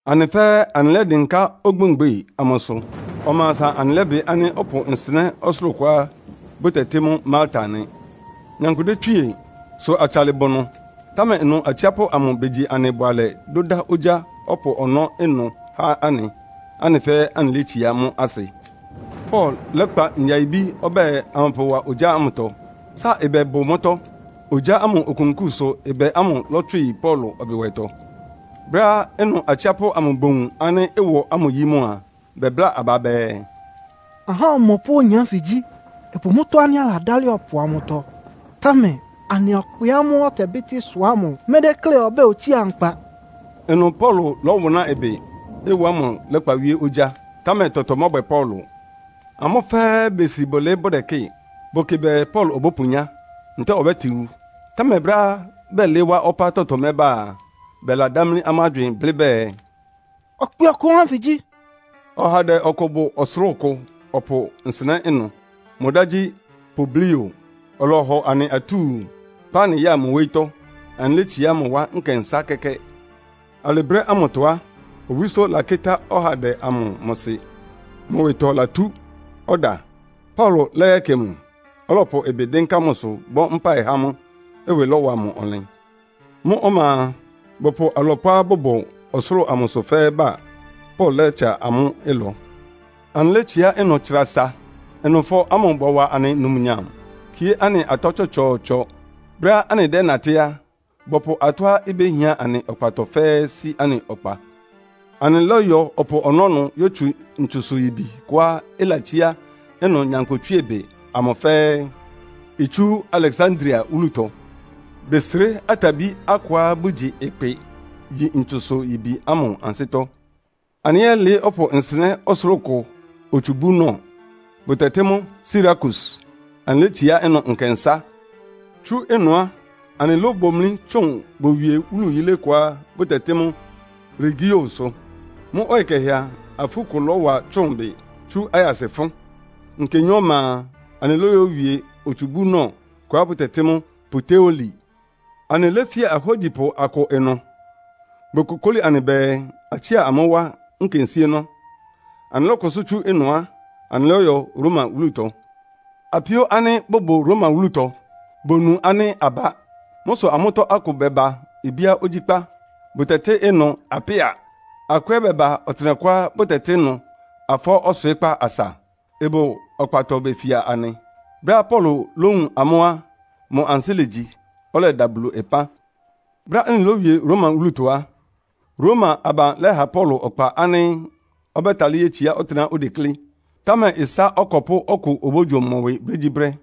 Anɩ fɛ́ɛ́ anɩlɛ́dɩnká ogbémgbe amʋsʋ. Ɔma asa anɩlɛ́bɩ ánɩ́ ɔpʋ nsɩnɛ́ ɔsʋlʋ́ʋ kʋá bʋtɛtɩ́ mʋ́ Malta nɩ. Nyankpʋ détswíe, sʋ atsalɩ bʋ ɩnʋ. Támɛ ɩnʋ atsiápʋ́ amʋ begyi anɩ bʋalɛ dʋ́dá ogyá ɔpʋ ɔnɔ́ ɩnʋ há anɩ, anɩ fɛ́ɛ́ anɩlétsiá mʋ́ asɩ. Paulo lɛ́kpa ngyayibí ɔbɛ́ɛ amʋpʋwa ogyá ámʋtɔ. Sáa ɩbɛ bʋ mʋ́tɔ́. Ogyá ámʋ okunkúu sʋ ɩbɛ ámʋ lɔ́tswɩ yi Paulo ɔbɩwɛtɔ. Brɛ́á ɩnʋ atsiápʋ́ amʋ bowun ánɩ́ ɩwɔ ámʋ yí mʋ a, bɛbláa aba bɛɛ, “Ahá ɔmɔpʋ́ oyin ánfɩ gyí. Ɩbʋ mʋ́tɔ́ ánɩ́ aladálɩ ɔpʋ amʋtɔ, támɛ anɩ ɔkpɩ ámʋ́ʋ́ ɔtɛbɩ́tɩ́ ɩsʋ ámʋ médékle ɔbɛ́ɛ otsía nkpa.” Ɩnʋ Paulo lɔ́wʋnáa ɩbɩ, ɩwɔ ámʋ lɛ́kpa wíé ogyá, támɛ tɔtɔ mɔ́bwɛ Paulo. Amʋ́ fɛ́ɛ́ besi bʋlɩɩ́ bʋdɛkɩ́ɩ. Bʋkɩ bɛɛ Paulo obópunyá, ntɛ́ɛ ɔbɛ́tɩn wu. Támɛ brɛ́á bɛlɩɩ́ wá ɔpá tɔtɔ mɛ́ba a, bɛladámlí amʋ́ agywɩɩn blɩ́ bɛɛ, “Ɔkpɩ ɔkʋ ɔhá ánfɩ gyí.” Ɔhandɛ ɔkʋ bʋ ɔsʋlʋ́ʋ kʋ ɔpʋ nsɩnɛ́ ɩnʋ. Mʋ dá gyí Publio. Ɔlɔhɔ anɩ atúu, kpá anɩ ya mʋ wóyítɔ́, anɩlétsiá mʋ wá nkɛnsá kɛ́kɛ́. Alɩ brɛ́ ámʋtɔ á, owísó lakɩ́tá ɔhandɛ amʋ mʋ sɩ, mʋ ɩwɩtɔ latú; ɔda. Paulo lɛ́yɛkɩ mʋ, ɔlɔpʋ ɩbɩ dɩ́nká mʋsʋ bɔ́ mpáɩ há mʋ, ɩwɩ lɔwa mʋ ɔnlɩn. Mʋ́ ɔma a, bɔpʋ alɔpʋá bʋbʋ ɔsʋlʋ́ʋ amʋsʋ fɛ́ɛ́ ba, Paulo lɛ́tsa amʋ́ ɩlɔ. Anɩlétsiá ɩnʋ tsra asa, ɩnʋfɔ ámʋ bɔwa anɩ numnyam, kíé anɩ atɔ́ tsɔtsɔɔtsɔ. Brɛ́á anɩdɛ́natɩ́ á, bɔpʋ atɔ́á ibéhián anɩ ɔkpatɔ fɛ́ɛ́ sí anɩ ɔkpa. Anɩlɔ́yɔ ɔpʋ ɔnɔ́ yótsu ntsusʋ-yibi kʋá ɩlatsíá ɩnʋ nyankpʋtswíebɩ amʋ fɛ́ɛ́. Itsú Aleksandria wúlutɔ. Besré atabí akʋá bʋgyi ɩkpɩ yi ntsusʋ-yibi ámʋ ansɩ́tɔ́. Anɩlɛ́yɛlɩɩ́ ɔpʋ nsɩnɛ́ ɔsʋlʋ́ʋ kʋ otsubúnɔ, bʋtɛtɩ́ mʋ́ Sirakus, anɩlétsiá ɩnʋ nkɛnsá. Tsú ɩnʋ á, anɩlóbomlí tsʋn bowie wúlu yílé kʋá bʋtɛtɩ́ mʋ́ Regiosʋ. Mʋ́ ɔyɩ kɛhɛ a, afú kʋ lɔ́wa tsʋ́ʋn bɩ tsu ayasɩ fʋ́n. Nkenyɔ́ ɔma a, anɩlóyowie otsubúnɔ kʋá bʋtɛtɩ́ mʋ́ Puteoli. Anɩléfía ahógyipʋ akʋ ɩnʋ. Bokokóli anɩ bɛɛ, atsía amʋ́ wá nkensíénɔ́. Anɩlɔ́kʋsʋ́ tsú ɩnʋ á, anɩlɔ́yɔ Roma wúlutɔ. Apíó ánɩ́ bʋbʋ Roma wúlutɔ bonu ánɩ́ abá. Mʋ́ sʋ amʋ́tɔ́ akʋ bɛba ibíá ogyíkpá, bʋtɛtɩ́ ɩnʋ Apia. Akʋ ɛ́ bɛba ɔtɩnɛkʋá bʋtɛtɩ́ ɩnʋ Afɔɔ́ Ɔswɩɩ́kpá Asa, ɩbʋ ɔkpatɔ befia anɩ. Brɛ́á Paulo lówun amʋ́ á, mʋ ansɩ́ legyi, ɔlɛda Bulu ɩpán. Brɛ́á anɩlóyowie Roma wúlutɔ á, Roma aban lɛ́ha Paulo ɔkpa ánɩ́ ɔbɛ́talɩ́ yétsiá ɔtɩ́nɛ́á odeklé, támɛ ɩsá ɔkɔpʋ́ ɔkʋ obógyo mʋ ɩwɩ brégyíbrɛ́.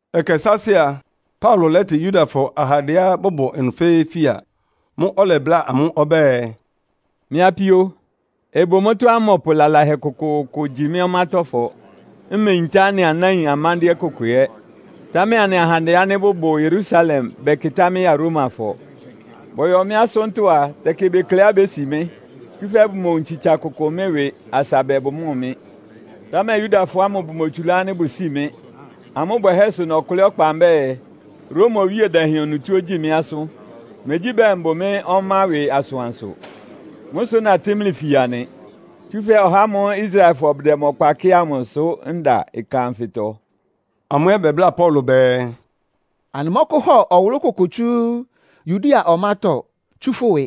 Ɛkɛ sáásɩ́ a, Paulo lɛ́tɩ Yudafɔ ahandɛá bʋbʋ ɩnʋ fɛ́ɛ́ fia. Mʋ́ʋ́ ɔlɛbláa amʋ́ ɔbɛ́ɛ, “Mɩ́ apíó, ɩbʋ mʋ́tɔ́á mmɔpʋ lalahɛ kʋkʋʋkʋ gyi mɩ́ ɔmátɔ́fɔ, mmeyintá anɩ anáin amándɩ́ɛ́ kʋkʋ ɛ́. Támɛ anɩ ahandɛ ánɩ́ bʋbʋ Yerusalem bɛkɩtá mɩ́ ya Romafɔ. Bɔyɔ mɩ́ asʋ́ntɔ́ á, tɛkɩ bekleá bési mɩ́, tsúfɛ́ bomowun tsitsa kʋkʋ mɩ́ ɩwɩ asa bɛɛ bʋmɔ́ɔ mɩ́. Támɛ Yudafɔ ámʋ bʋmotsulá ánɩ́ bʋsíi mɩ. Amʋ́ bwɛhɛ́ sʋ nɔkʋlɩ́ ɔkpa mbɛ́ɛ, Roma Owíe Dɛhɛn onutó ogyíi mɩ́ asʋ́n. Megyí bɛɛ mbʋ mɩ́ ɔmá ɩwɩ asʋansʋ. Mʋ́ sʋ natɩ́ mlɩ fia nɩ. Tsúfɛ́ ɔhá ámʋ́ʋ́ Israelfɔ bʋdɛ mʋ ɔkpa kɩ́ɩ amʋ sʋ́ nda ɩkan anfɩtɔ.” Amʋ́ ɛ́ bɛbláa Paulo bɛɛ, “Anɩmɔ́kʋ́hɔ ɔwʋlʋ́ kʋkʋ tsú Yudea ɔmátɔ́ tsú fʋ́ ɩwɩ.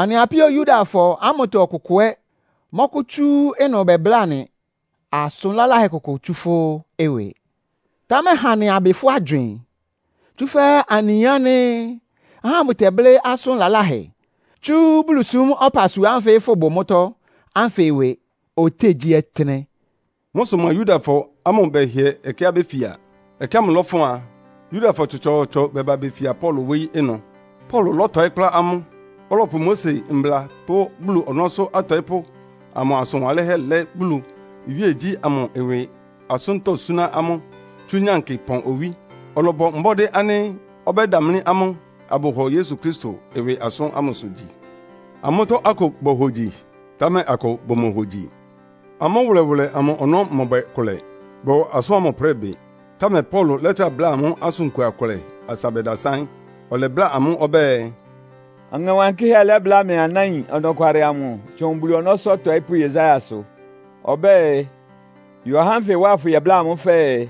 Anɩ apíó Yudafɔ ámʋtɔ ɔkʋkʋ ɛ́ mɔ́kʋ́tsú ɩnʋ bɛbláa anɩ asʋn laláhɛ kʋkʋ tsú fʋ́ ɩwɩ. Támɛ ha anɩ abɩ fʋ́ agywɩɩn. Tsúfɛ́ anɩyin ánɩ́ ahá bʋtɛblɩ́ asʋn laláhɛ tsú Bulusúm ɔpasua ánfɩ fʋ́bʋ mʋ́tɔ́ ánfɩ ɩwɩ ɔtɩ́nɛgyíɔtɩ́nɛ́.” Mʋ́ sʋ mʋa Yudafɔ ámʋ bɛhɩɛ ɛkɛá béfia. Ɛkɛ ámʋ lɔ́fʋn a, Yudafɔ tsɔtsɔɔtsɔ bɛba befia Paulo wóyí ɩnʋ. Paulo lɔ́tɔɩ́ kplá amʋ́. Ɔlɔpʋ Mose Mbla pʋ́ Bulu ɔnɔ́sʋ́ atɔɩ́pʋ́ amʋ asʋn wanlɩ́nhɛ́ lɛ́ Bulu iwíegyí ámʋ ɩwɩ asʋ́ntɔ́ súná amʋ́ tsú nyankɩ pɔn owí. Ɔlɔbɔ mbɔ́dɩ́ ánɩ́ ɔbɛ́damlí amʋ́ abʋhɔ Yesu Kristo ɩwɩ asʋ́n ámʋsʋ gyi. Amʋ́tɔ́ akʋ bohogyi, támɛ akʋ bʋmohogyi. Amʋ́ wʋlɛwʋlɛ amʋ ɔnɔ́ mɔbwɛ kʋlɛ, bɔwa asʋ́n ámʋ prɩ́ɩ bɩ. Támɛ Paulo lɛ́trá bláa amʋ́ asʋn kua kʋlɛ asa bɛdasáɩ́n. Ɔlɛbláa amʋ́ ɔbɛ́ɛ, “Ɔŋɛ Wankɩ́hɛ́ lɛ́bláa mlɩ anáin ɔnɔkwalɩ amʋ tsʋn Bulu ɔnɔ́sʋ́ ɔtɔɩ́pʋ́ Yesaiasʋ. Ɔbɛ́ɛ, ‘Yɔ ahá ánfɩ wá afʋyɛbláa amʋ́ fɛɛ,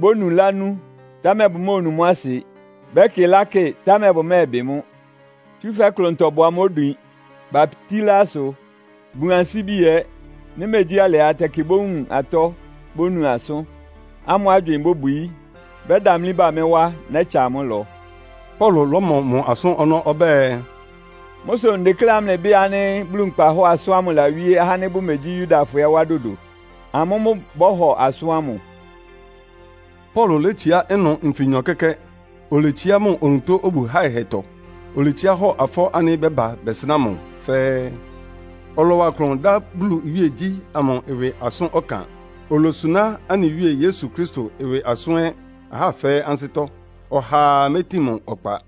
Bónu lánú, támɛ bʋmóonu mʋ́ asɩ. Bɛ́kɩ lákɩ, támɛ bʋmɛ́ɛbɩ mʋ́. Tsúfɛ́ klʋntɔ bʋ amʋ́ odwin. Batílá asʋ, bun ansíbi ɛ́. Nɩ́ megyí alɩ á, tɛkɩ bówun atɔ́ bónu asʋ́n, amʋ́ agywɩɩn bóbwií. Bɛ́damlí ba mɩ́ wá, nɛ́tsa amʋ́ ɩlɔ.’” Paulo lɔ́mɔ mʋ asʋ́n ɔnɔ́ ɔbɛ́ɛ, “Mʋ́ sʋ ndekléá mlɩbɩ́ɩ ánɩ́ Bulu nkpahɔ́ɔ asʋ́n ámʋ lawíé ahá ánɩ́ bʋmegyí Yudafɔ ɛ́ wá dodo. Amʋ́ mʋ́ bɔ́hɔ asʋ́n ámʋ.” Paulo létsiá ɩnʋ nfinyɔ kɛ́kɛ́. Oletsiá mʋ onutó obu háɩhɛtɔ. Oletsiá hɔ afɔɔ́ ánɩ́ bɛba bɛsɩnáa mʋ fɛ́ɛ́. Ɔlɔwa klʋn dá Bulu iwíegyí ámʋ ɩwɩ asʋ́n ɔkan, olosuná anɩ Wíe Yesu Kristo ɩwɩ asʋ́n ɛ́ ahá fɛ́ɛ́ ansɩ́tɔ́. Ɔhaa métin mʋ ɔkpa.